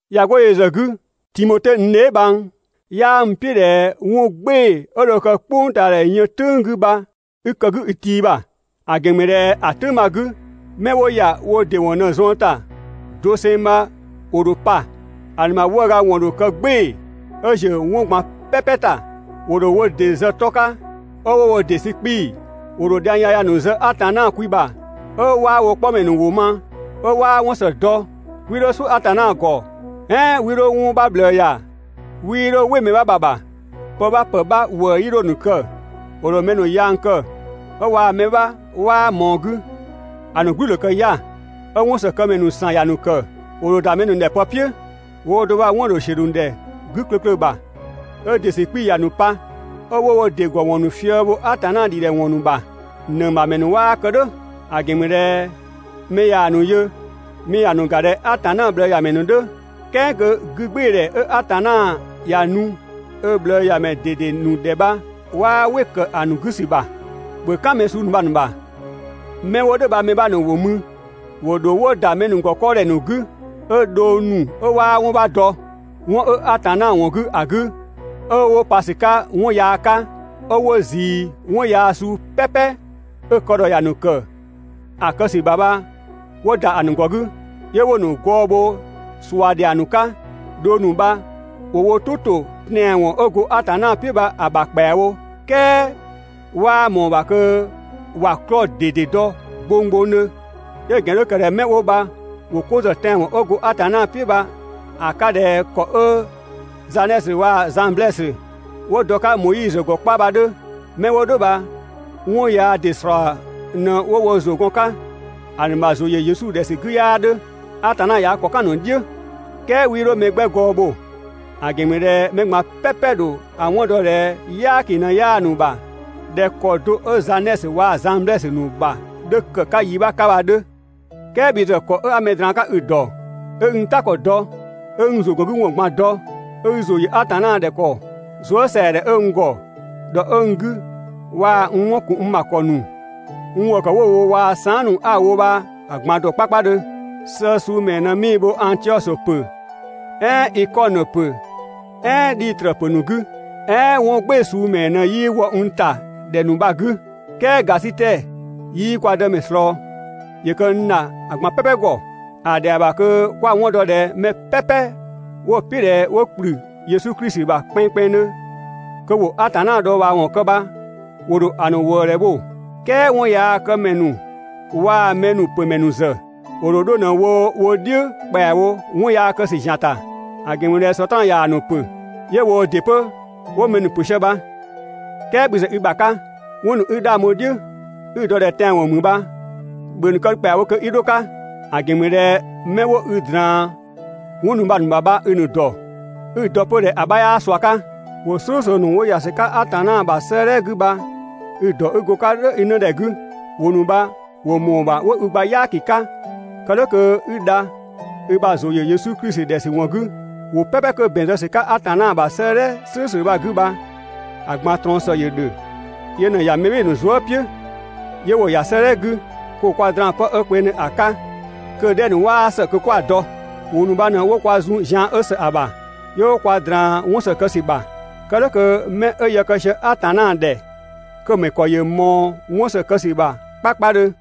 ꞊Ya 'go yö ‑zë 'gü, Timote n dheebhang, 'yaa n "piʋ̈ ꞊dhɛ 'wɔn "gbɩɩ‑ 'ö dho kë "kpʋngtaadhɛ yën "tʋ̈ng 'gü bha 'i kë‑ 'gü i tii ‑bha. ‑A ‑gɛn ‑mü ꞊dhɛ ‑a "tʋ̈ng bha‑ 'gü, 'mɛ 'wo ‑ya wo ‑dɩ ‑wɔn ꞊në‑ zuën ‑ta doseng bha ‑wo ‑dho pa. ‑A ‑nu ‑bha 'wëëga ‑wɔn ‑dho kë "gbɩɩ‑ 'ö ‑ziö 'wɔn ꞊gban "pɛpɛ ‑ta. ‑Wo ‑dho wo ‑dɩ zë 'tɔ 'ka 'ö 'wo wo ‑dɩ sü 'kpii‑. ‑Wo ‑dho dhiang yaya ‑nu zë Atanna kwi ‑bha 'ö 'waa wo 'kpɔmɛ ‑nu ‑wʋ ma, 'ö 'waa 'wɔn ‑së dɔ. 'Wii 'dho "suʋ̈ Atanna ‑gɔ, "ɛɛn 'wii 'dho 'wɔn 'bha ꞊bhlëë ‑ya. 'Wii 'dho "wɩ mɛ 'bha ‑bha ‑bha. Pë 'bha ‑pë 'bha ‑wëë 'yii 'dho‑ ‑nu kë. ‑Wo ‑dho mɛ ‑nu yang kë 'ö waa‑ mɛ 'bha ‑mɛ 'bha 'waa ꞊mɔɔ‑ 'gü. ‑A ‑nu "gblü‑ ‑dho kë 'ya‑, 'ö 'wɔnsëkëmɛ ‑nu ‑san ‑ya ‑nu ‑kë. ‑Wo ‑dho ‑da mɛ ‑nu ‑dhɛ pë "piʋ̈, woo do bha 'wɔn‑ ‑dho ‑siö ‑nu ‑dhɛ 'gü klöklö ‑bha, 'ö ‑dɩ ‑sü 'kpii‑ ‑ya ‑nu pa, 'ö 'wo wo ‑dɩ ‑gɔwɔn ‑nu fië‑ bho Atanna ‑dhidhɛwɔn ‑nu ‑bha. (‑Nëng ‑bha ‑mɛ ‑nu 'waa kë "dhʋ̈). ‑A ‑gɛn ‑mü ꞊dhɛ mɛ ꞊yaa‑ ‑nu yö, mɛ ‑ya ‑nu ‑ga ꞊dhɛ Atanna ꞊bhlëëyamɛ ‑nu 'dhö, "kɛɛ kö 'gügbɩɩdhɛ 'ö Atanna ‑ya nu ö ꞊bhlëëyamɛ ꞊dede ‑nu ‑dhɛ bha 'waa "wɩ‑ ‑kë ‑a ‑nu 'gü ‑sü ‑bha. ‑Bhö "kan mɛ suu ‑nu bha‑ ‑nu ‑bha. 'Mɛ 'wo "dhʋ̈ bha‑ mɛ 'bha ‑nu ‑wo mü, ‑wo ‑dho 'wo ‑da mɛ ‑nu ‑gɔ 'kɔɔdhɛ ‑nu 'gü, 'ö dhong ‑nu 'ö 'waa 'wɔn 'bha dɔ 'wɔn 'ö Atanna ‑wɔn 'gü ‑a 'gü, 'ö 'wo pa ‑sü 'ka 'wɔn yaa 'ka, 'ö 'wo ꞊zii 'wɔn yaa suu "pɛpɛ 'ö‑ kë ‑dhɔ ‑ya ‑nu ‑kë ‑a kë ‑sü ‑bha bha 'wo ‑da ‑a ‑nu ‑gɔ 'gü, 'yö 'wo‑ ‑nu gɔɔ bho ꞊sua ‑dhiang ‑nu 'ka. Dhong ‑nu bha ‑wo wo "tʋ ‑to tɛanwɔn 'ö go Atanna "piʋ̈ bha‑ ‑bha ‑kpɛawo "kɛɛ 'waa ꞊mɔɔ‑ ‑bha kö ‑wa 'klɔɔ‑ ꞊dede dɔ gbonggbongdhö. 'Ö‑ ‑gɛn 'dhö ‑kë ꞊dhɛ 'mɛ 'wo bha ‑wo 'ko ‑zë tɛanwɔn 'ö go Atanna "piʋ̈ bha‑ 'ka ꞊dhɛ ‑kɔ 'ö Zanɛsö waa‑ Zanblɛsö 'wo dɔ‑ 'ka Moizö ‑gɔ 'kpa bha‑ 'dhö. 'Mɛ 'wo "dhʋ̈ bha 'wɔn yaa ‑dɩ ‑slɔɔ ꞊në 'wo wo ‑zʋ gɔn‑ 'ka, ‑a ‑nu ‑bha ‑zʋ ‑yö Yesu ‑dhɛ ‑sü 'gü 'yaa 'dhö, (Atanna ꞊ya ö ‑kɔ "kan‑ ‑nu "dhiʋ̈). "Kɛɛ 'wii 'dho mɛ 'gbɛ gɔɔ bho; ‑a ‑gɛn ‑mü ꞊dhɛ mɛ ꞊gban "pɛpɛ‑ ‑dho ‑a 'wɔn dɔ ꞊dhɛ "yaaki ꞊në 'yaa‑ ‑nu ‑bha ꞊dhɛ ‑kɔ do 'ö Zanɛsö waa‑ Zanblɛsö ‑nu ‑bha 'dhö ‑kë 'ka yi 'bha 'ka bha‑ 'dhö. "Kɛɛ bhi ‑zë ‑kɔ 'a mɛ ꞊draan‑ 'ka i‑ ‑dɔ, 'ö 'i n "ta ‑kɔ dɔ, 'ö 'i n ‑zʋgɔngüwɔn ꞊gban dɔ, 'ö 'i ‑zʋ ‑yö Atanna ‑dhɛ ‑kɔ, zuësɛadhɛ 'ö n ‑gɔ, ‑dhɔ 'ö n 'gü waa‑ n 'wɔn ‑kun n ‑bha ‑kɔ ‑nu, n ‑wëë ‑kë 'wo‑ wo waa‑ saan" ‑nu 'a‑ wo bha‑ ꞊gban ‑dɔ 'kpakpadhö. Sëë suu ‑mɛɛ ꞊në 'mii‑ bho Angtiɔsö ‑pö, "ɛɛn Ikɔnö ‑pö "ɛɛn Dhitrö ‑pö ‑nu 'gü? "Ɛɛn 'wɔn "gbɩɩ‑ suu ‑mɛɛ ꞊në 'yii wɔ n ‑ta ‑dhɛ ‑nu bha‑ 'gü? "Kɛɛ ‑gasitɛ 'yii kwa Dëmɛ ꞊slɔɔ, ‑yö kë n ‑dha ‑a ꞊gban "pɛpɛ ‑gɔ. ‑A ‑dhɛa ‑bha kö 'kwa‑ 'wɔn dɔ ꞊dhɛ mɛ "pɛpɛ 'wo‑ "piʋ̈ ꞊dhɛ 'wo ‑kplü Yesu Klisi ‑bha kpɛnngkpɛnngdhö kö 'wo Atanna dhɔɔbhaawɔn kë bha ‑wo ‑dho ‑a ‑nu ‑wëëdhɛ bho, "kɛɛ 'wɔnyaakëmɛ ‑nu waa‑ mɛ ‑nu ‑pö ‑mɛ ‑nu ‑zë, ‑wo ‑dho 'dho ꞊në‑ wo wo "dhiʋ̈ ‑kpɛawo 'wɔn yaa kë ‑zian ‑ta. ‑A ‑gɛn ‑mü ꞊dhɛ Sɔtraan ꞊yaa‑ ‑nu ‑pö, 'yö woo ‑dɩ 'pö 'wo mɛ ‑nu pö sië bha. "Kɛɛ bhi ‑zë i ‑bha 'ka, 'wɔn ‑nu 'i‑ 'dhang bho‑ "dhiʋ̈, 'i‑ dɔ ꞊dhɛ tɛanwɔn ‑mü bha, ‑bhö ‑a ‑nu kë ‑kpɛawo kö 'i dho‑ 'ka. ‑A ‑gɛn ‑mü ꞊dhɛ 'mɛ 'wo i ꞊draan 'wɔn ‑nu bha‑ ‑bha bha i‑ ‑nu ‑dɔ, 'i‑ dɔ 'pö ꞊dhɛ ‑a 'bha 'yaa ꞊sua 'ka. ‑Wʋ "slʋ̈ʋ̈slʋ̈ ‑nu 'wo ‑ya ‑sü 'ka Atanna ‑bha 'sëëdhɛ 'gü i‑ ‑dɔ 'i go‑ 'ka "dhʋ̈ i 'nëdhɛ 'gü, ‑wʋ ‑nu bha ‑wo ‑mɔɔ ‑bha 'wo i gba "yaaki 'ka kë "dhʋ̈ kö 'i dha i ‑bha ‑zʋ ‑yö Yesu Klisi ‑dhɛ ‑sü ‑wɔn 'gü. ‑Wʋ "pɛpɛ 'kö ‑bɛn zë ‑sü 'ka Atanna ‑bha 'sëëdhɛ "slʋ̈ʋ̈slʋ̈ bha‑ 'gü bha‑ ꞊gban ꞊trɔɔn ‑së ‑yö ‑dhö, yö ꞊në‑ ‑ya mɛ "bhɩɩ‑ ‑nu zuë" "piʋ̈ 'yö 'wo‑ ‑ya 'sëëdhɛ 'gü, kö ‑wo kwa draan‑ pë 'ö kpengdhö ‑a 'ka, kö‑ 'dhɛ ‑nu 'ö 'waa ‑së kö 'kwa‑ dɔ. ‑Wʋ ‑nu bha ꞊në 'wo kwa zun zian 'ö ‑së ‑a ‑bha, 'yö 'wo kwa ꞊draan 'wɔn ‑së kë ‑sü ‑bha. Kë "dhʋ̈ kö 'mɛ 'ö yë kë sië Atanna ‑dhɛ kö‑ ‑mɛ ‑kɔ ‑yö ꞊mɔɔ 'wɔn ‑së kë ‑sü ‑bha 'kpakpadhö.